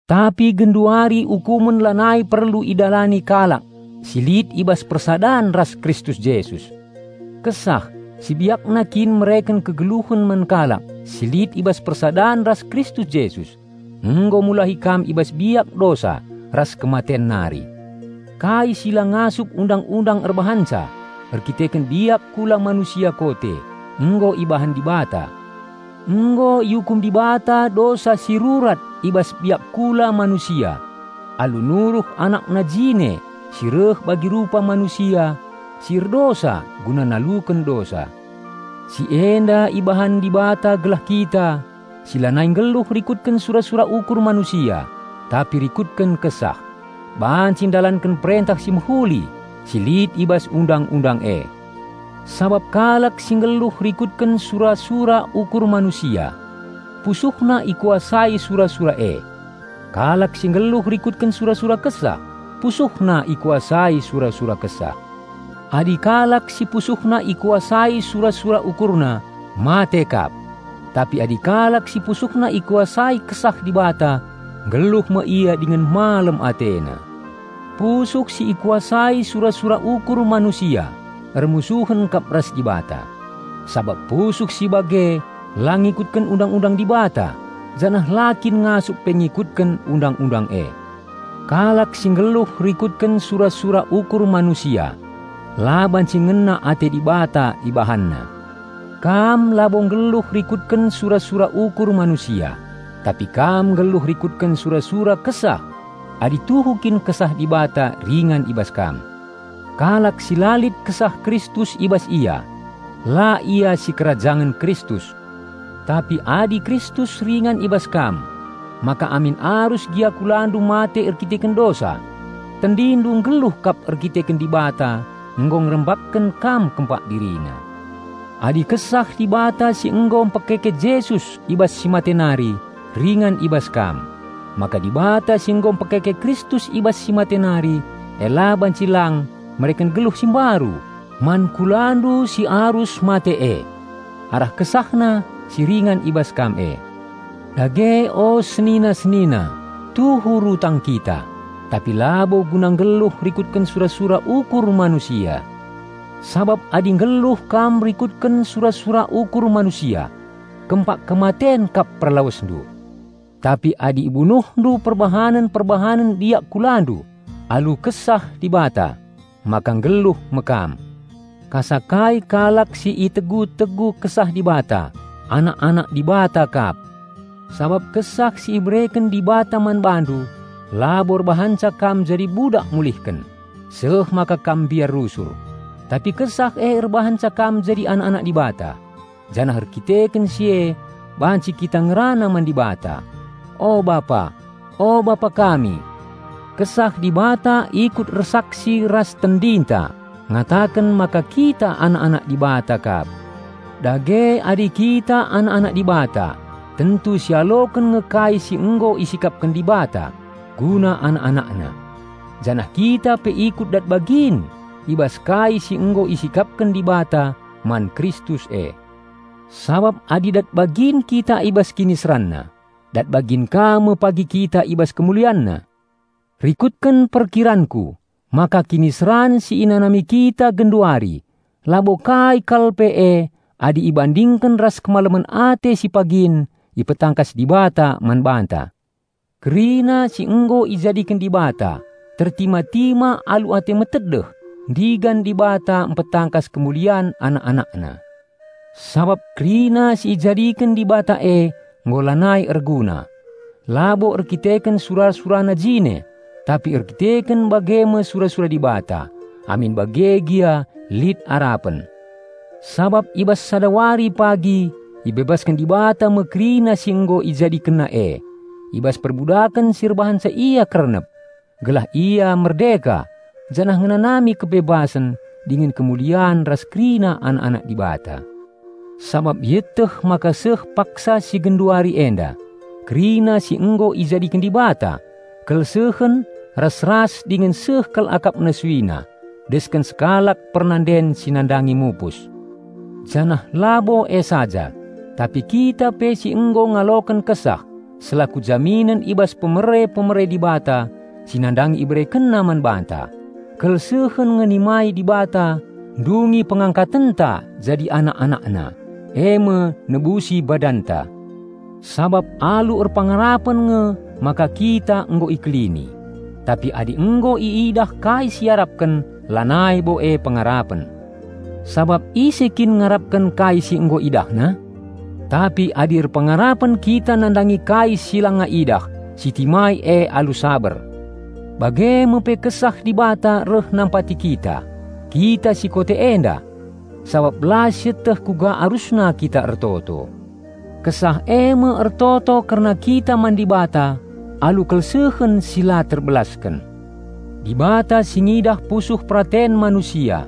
Tapi genduari ukumen lanai perlu idalani kalak si lit i bas persadan ras Kristus Jesus. Kesah, si biakna kin mereken kegeluhen man kalak si lit i bas persadan ras Kristus Jesus, nggo mulahi kam i bas biak dosa ras kematen nari. Kai si la ngasup Undang-undang erbahanca erdandanken biak kula manusia kote, nggo ibahan Dibata. Nggo iukum Dibata dosa si rurat i bas biak kula manusia alu nuruh AnakNa jine si reh bagi rupa manusia si erdosa guna naluken dosa. Si enda ibahan Dibata gelah kita, si lanai nggeluh rikutken sura-sura ukur manusia tapi rikutken Kesah, banci ndalanken perentah si mehuli si lit i bas Undang-undang e. Sabap kalak si nggeluh rikutken sura-sura ukur manusia, pusuhna ikuasai sura-sura e. Kalak si nggeluh rikutken sura-sura Kesah, pusuhna ikuasai sura-sura Kesah. Adi kalak si pusuhna ikuasai sura-sura ukurna mate kap; tapi adi kalak si pusuhna ikuasai Kesah Dibata nggeluh me ia dingen malem atena. Pusuh si ikuasai sura-sura ukur manusia ermusuhen kap ras Dibata; sabap pusuh si bage la ngikutken Undang-undang Dibata, janah la kin ngasup pe ngikutken Undang-undang e. Kalak si nggeluh rikutken sura-sura ukur manusia la banci ngena ate Dibata ibahanna. Kam labo nggeluh rikutken sura-sura ukur manusia, tapi kam nggeluh rikutken sura-sura Kesah adi tuhu kin Kesah Dibata ringan i bas kam. Kalak si la lit Kesah Kristus i bas ia, la ia sikerajangen Kristus. Tapi adi Kristus ringan i bas kam, maka amin arus gia kulandu mate erdandanken dosa, tendindu nggeluh kap erkiteken Dibata nggo ngerembakken kam kempak DiriNa. Adi Kesah Dibata si nggo mpekeke Jesus i bas si mate nari ringan i bas kam, maka Dibata si nggo mpekeke Kristus i bas si mate nari e la banci lang mereken geluh si mbaru man kulandu si arus mate e, arah KesahNa si ringan i bas kam e. Dage o senina-senina, tuhu rutang kita; tapi labo guna nggeluh rikutken sura-sura ukur manusia. Sabap adi nggeluh kam rikutken sura-sura ukur manusia, kempak kematen kap perlawesndu. Tapi adi ibunuhndu perbahanen-perbahanen biak kulandu alu Kesah Dibata, maka nggeluh me kam. Kasa kai kalak si itegu-tegu Kesah Dibata, anak-anak Dibata kap. Sabap Kesah si ibereken Dibata man bandu labo erbahanca kam jadi budak si mulihken, seh maka kam mbiar rusur, tapi Kesah e erbahanca kam jadi anak-anak Dibata, janah erdandanken si e banci kita ngerana man Dibata, "O Bapa! O Bapa kami!" Kesah Dibata ikut ersaksi ras tendinta ngataken maka kita anak-anak Dibata kap. Dage adi kita anak-anak Dibata tentu sialoken nge kai si nggo isikapken Dibata guna anak-AnakNa. Janah kita pe ikut dat bagin i bas kai si nggo isikapken Dibata man Kristus e; sabap adi dat bagin kita i bas KiniseranNa, dat bagin ka me pe kita i bas KemulianNa. Rikutken perkiranku maka kiniseran si inanami kita genduari labo kai kal pe e adi ibandingken ras kemalemen ate si pagin ipetangkas Dibata man banta. Kerina si nggo ijadiken Dibata tertima-tima alu ate metedeh ndigan Dibata mpetangkas kemulian anak-anakna. Sabap kerina si ijadiken Dibata e nggo lanai erguna, labo erkiteken sura-surana jine, tapi erkiteken bage me sura-sura Dibata. Amin bage gia lit arapen. Sabap i bas sada wari pagi ibebasken Dibata me kerina si nggo IjadikenNa e i bas perbudaken si erbahanca ia kernep, gelah ia merdeka janah ngenanami kebebasen dingen kemulian ras kerina anak-anak Dibata. Sabap ieteh maka seh paksa si genduari enda kerina si nggo ijadiken Dibata kelsehen ras-ras dingen seh kal akapna suina desken sekalak pernanden si nandangi mupus. Janah labo e saja, tapi kita pe si nggo ngaloken Kesah selaku jaminen i bas pemere-pemere Dibata si nandangi IberekenNa man banta, kelsehen nge nimai Dibata ndungi pengangkatenta jadi anak-AnakNa, eme nebusi badanta. Sabap alu erpengarapen nge maka kita nggo ikelini; tapi adi nggo iidah kai si iarapken lanai bo e pengarapen. Sabap ise kin ngarapken kai si nggo idahna? Tapi adi erpengarapen kita nandangi kai si langa idah, sitimai e alu saber. Bage me pe Kesah Dibata reh nampati kita, kita si kote enda. Sabap la sieteh kuga arusna kita ertoto; Kesah eme ertoto kerna kita man Dibata alu kelsehen si la terbelasken. Dibata si ngidah pusuh peraten manusia,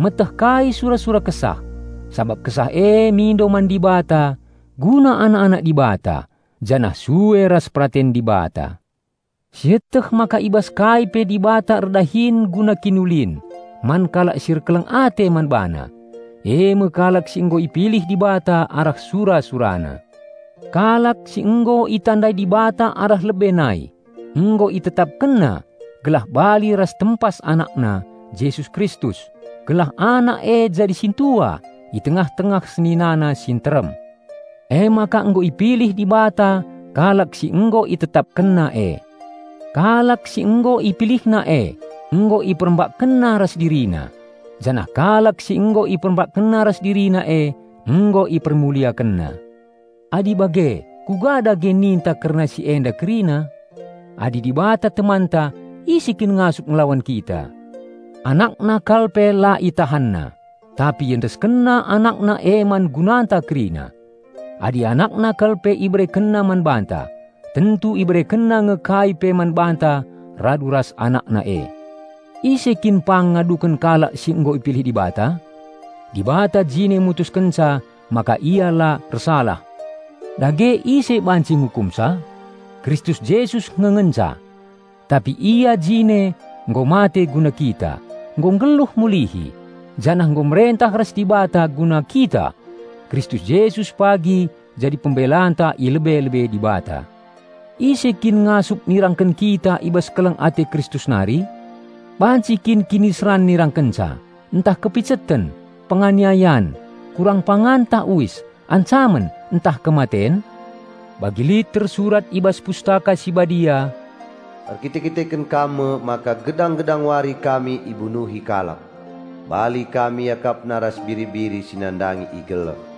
meteh kai sura-sura Kesah; sabap Kesah e mindo man Dibata guna anak-anak Dibata, janah sue ras peraten Dibata. Sieteh maka i bas kai pe Dibata erdahin guna kiniulin man kalak si erkeleng ate man BaNa, eme kalak si nggo ipilih Dibata arah sura-SuraNa. Kalak si nggo itandai Dibata arah lebe nai, nggo ItetapkenNa gelah bali ras tempas AnakNa, Jesus Kristus, gelah Anak e jadi sintua i tengah-tengah seninana si nterem. Emaka nggo ipilih Dibata kalak si nggo ItetapkenNa e; kalak si nggo IpilihNa e nggo IperembakNa ras DiriNa; janah kalak si nggo IperembakNa ras DiriNa e nggo IpermuliakenNa. Adi bage, kuga dage ninta kerna si enda kerina? Adi Dibata temanta, ise kin ngasup ngelawan kita? AnakNa kal pe la ItahanNa, tapi IendeskenNa AnakNa e man gunanta kerina. Adi AnakNa kal pe IberekenNa man banta, tentu IberekenNa nge kai pe man banta radu ras AnakNa e. Ise kin pang ngaduken kalak si nggo ipilih Dibata? Dibata jine mutuskenca maka ia la ersalah! Dage ise banci ngukumsa? Kristus Jesus nge ngenca! Tapi Ia jine nggo mate guna kita, nggo nggeluh mulihi, janah nggo merentah ras Dibata guna kita! Kristus Jesus pagi jadi pembelanta i lebe-lebe Dibata. Ise kin ngasup nirangken kita i bas keleng ate Kristus nari? Banci kin kiniseran nirangkenca, ntah kepiceten, penganiayan, kurang pangan tah uis, ancamen, ntah kematen? Bagi lit tersurat i bas Pustaka Si Badia, "Erkite-kiteken Kam me maka gedang-gedang wari kami ibunuhi kalak. Bali kami iakapna ras biri-biri si nandangi igeleh."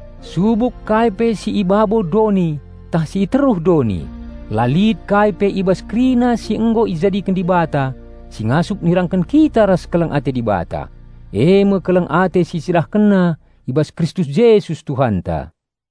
Subuk kai pe si i babo doni tah si i teruh doni, la lit kai pe i bas kerina si nggo ijadiken Dibata si ngasup nirangken kita ras keleng ate Dibata, eme keleng ate si CidahkenNa i bas Kristus Jesus Tuhanta.